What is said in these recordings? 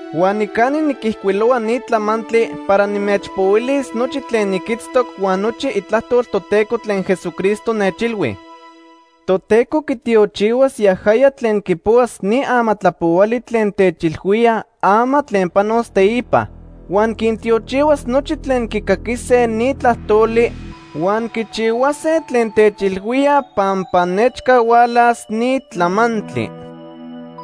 Huan nicani niquijcuilohua ni tlamantli para nimechpohuilis nochi tlen niquitztoc huan nochi itlajtol Toteco tlen Jesucristo nechilhui. Toteco quitiochihuas yajaya tlen quipohuas ni amatlapohuali tlen techilhuía ama tlen panos teipa. Huan quintiochihuas nochi tlen quicaquise ni tlajtoli huan quichihuase tlen techilhuía pampa nechca hualas ni tlamantli.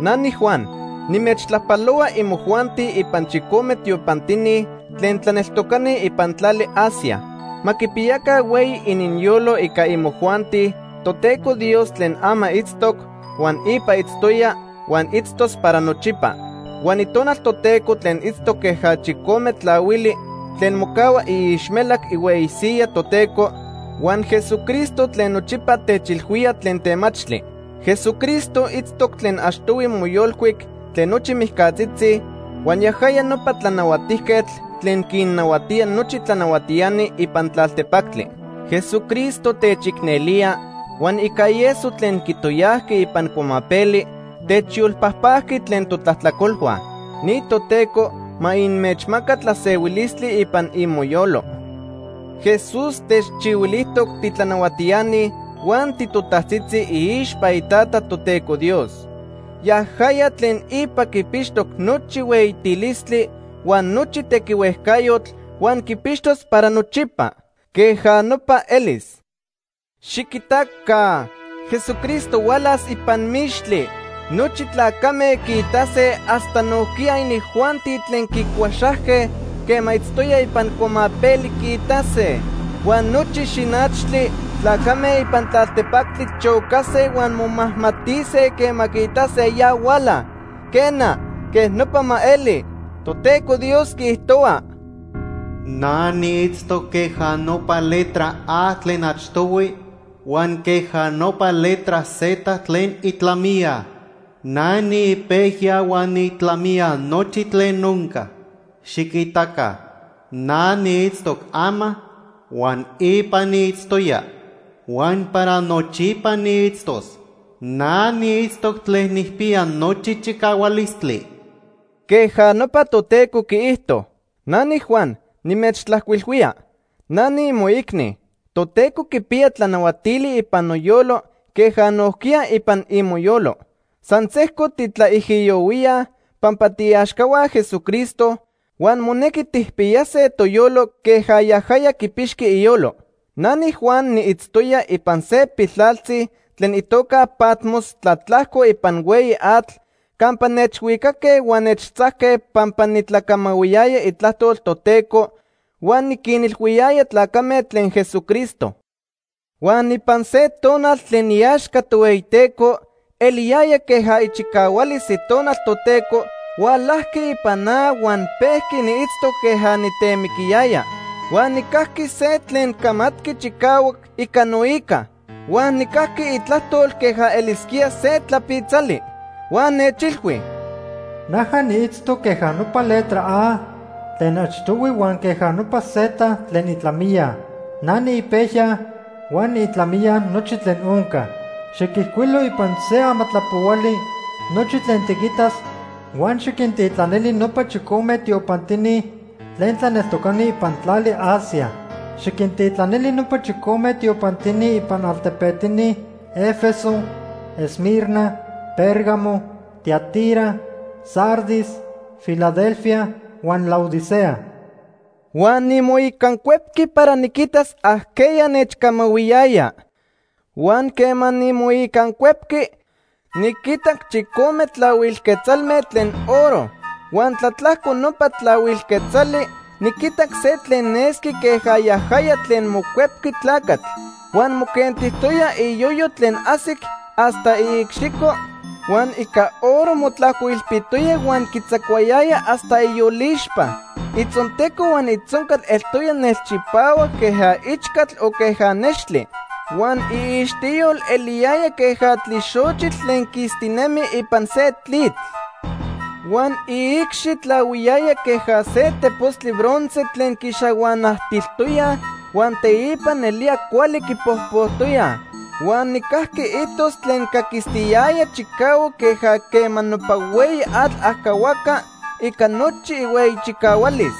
Na niJuan, nimechtlajpalohua imojuanti ipan chicome tiopantini tlen tlaneltocani ipan tlali Asia. Ma quipiyaca hueyi ininyolo ica imojuanti Toteco Dios tlen ama itztoc, huan ipa itztoya, huan itztos para nochipa; huan Itonal Toteco tlen itztoc queja chicome tlahuili tlen mocahua iixmelac ihueyi siyaj Toteco, huan Jesucristo tlen nochipa techilhuía tlen temachtli. Jesucristo itztoc tlen achtohui moyolcuic tlen nochi mijcatzitzi, huan yajaya nopa tlanahuatijquetl tlen quinnahuatía nochi tlanahuatiani ipan tlaltepactli. Jesucristo techicnelía huan ica ieso tlen quitoyajqui ipan cuamapeli, techyolpajpajqui tlen totlajtlacolhua. Ni Toteco ma inmechmaca tlasehuilistli ipan imoyolo. Jesús techchihuilijtoc titlanahuatiani huan titotajtzitzi iixpa iTata, Toteco Dios. Yajaya tlen ipa quipixtoc nochi hueyitilistli huan nochi tequihuejcayotl huan quipixtos para nochipa. Queja nopa elis. Xiquitaca, Jesucristo hualas ipan mixtli. Nochi tlacame quiitase hasta nojquiya inijuanti tlen quicuaxajque quema itztoya ipan cuamapeli quiitase. Huan nochi xinachtli tlacame ipan tlaltepactli chocase huan momajmatise quema quiitase ya huala. Quena, queja nopa ma eli. Toteco Dios quiijtohua: “Na niitztoc queja nopa letra A tlen achtohui huan queja nopa letra Z tlen itlamiya. Na niipejya huan niitlamiya nochi tlen onca. Xiquitaca, na niitztoc ama huan ipa niitztoya huan para nochipa niitztos. Na niitztoc Tlen Nijpiya Nochi Chicahualistli.” Queja nopa Toteco quiijto. Na niJuan nimechtlajcuilhuía. Na niimoicni. Toteco quipiya tlanahuatili ipan noyolo queja nojquiya ipan imoyolo. San sejco titlaijiyohuíaj pampa tiiaxcahua Jesucristo huan monequi tijpiyase toyolo queja yajaya quipixqui iyolo. Na niJuan niitztoya ipan se piltlaltzi tlen itoca Patmos tlatlajco ipan hueyi atl campa nechhuicaque huan nechtzajque pampa nitlacamahuiyaya itlajtol Toteco huan niquinilhuiyaya tlacame tlen Jesucristo. Huan ipan se tonal tlen iaxca Tohueyiteco, eliyaya queja ichicahualis Itonal Toteco hualajqui ipan na huan pejqui niitztoc queja nitemiquiyaya. Huan nijcajqui se tlen camatqui chicahuac ica noica. Huan nijcajqui itlajtol queja elisquía se tlapitzali. Huan nechilhui: “Naja niitztoc queja nopa letra A tlen achtohui huan queja nopa Z tlen itlamiya. Na niipejya huan niitlamiya nochi tlen onca. Xiquijcuilo ipan se amatlapohuali nochi tlen tiquitas huan xiquintitlanili nopa chicome tiopantini tlen tlaneltocani ipan tlali Asia. Xiquintitlanili nopa chicome tiopantini ipan altepetini Éfeso, Esmirna, Pérgamo, Tiatira, Sardis, Filadelfia huan Laodicea.” Huan nimoicancuepqui para niquitas ajqueya nechcamahuiyaya. Huan quema nimoicancuepqui, niquitac chicome tlahuil quetzalme tlen oro. Huan tlatlajco nopa tlahuil quetzali niquitac se tlen nesqui queja yajaya tlen Mocuepqui Tlacatl. Huan moquentijtoya iyoyo tlen ajsic hasta iicxico huan ica oro motlajcoilpitoya huan quitzacuayaya hasta iyolixpa. Itzonteco huan itzoncal eltoya nelchipahuac queja ichcatl o queja nextli. Huan iixtiyol eliyaya queja tlixochitl tlen quistinemi ipan se tlitl. Huan iicxi tlahuiyaya queja se tepostli bronce tlen quixahuanajtiltoyaj huan teipa nelía cuali quipojpojtoyaj. Huan nijcajqui itos tlen caquistiyaya chicahuac queja quema nopa hueyi atl ajcahuaca ica nochi ihueyi chicahualis.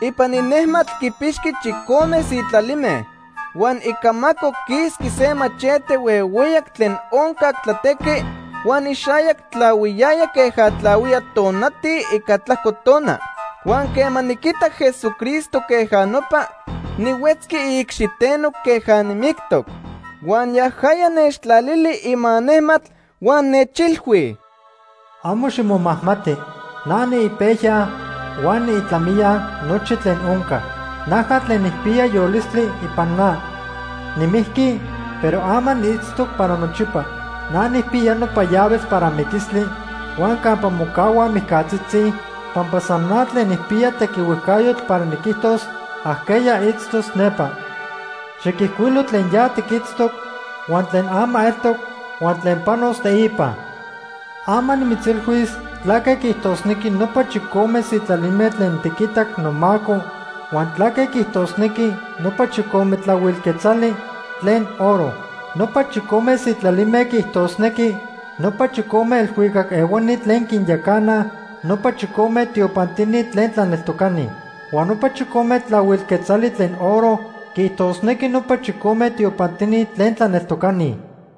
Ipan inejmatl quipixqui chicome sitlalime. Huan icamaco quisqui se machete huehueyac tlen oncac tlatequi, huan ixayac tlahuiyaya queja tlahuía tonati ica tlajco tona. Huan quema niquitac Jesucristo queja nopa, nihuetzqui iicxiteno queja nimictoc. Huan yajaya nechtlalili ima nejmatl huan nechilhui: “Amo ximomajmati. Na niipejya huan niitlamiya nochi tlen onca. Naja tlen nijpiya yolistli ipan na. Nimijqui, pero ama niitztoc para nochipa. Na nijpiya nopa llaves para miquistli huan campa mocahuaj mijcatzitzi, pampa san na tlen nijpiya tequihuejcayotl para niquijtos ajqueya itztos nepa. Xiquijcuilo tlen ya tiquitztoc, huan tlen ama eltoc, huan tlen panos teipa. Ama nimitzilhuis tlaque quiijtosnequi nopa chicome sitlalime tlen tiquitac nomaco huan tlaque quiijtosnequi nopa chicome tlahuil quetzali tlen oro. Nopa chicome sitlalime quiijtosnequi nopa chicome elhuicac ehuani tlen quinyacanaj nopa chicome tiopantini tlen tlaneltocani. Huan nopa chicome tlahuil quetzali tlen oro quiijtosnequi nopa chicome tiopantini tlen tlaneltocani.”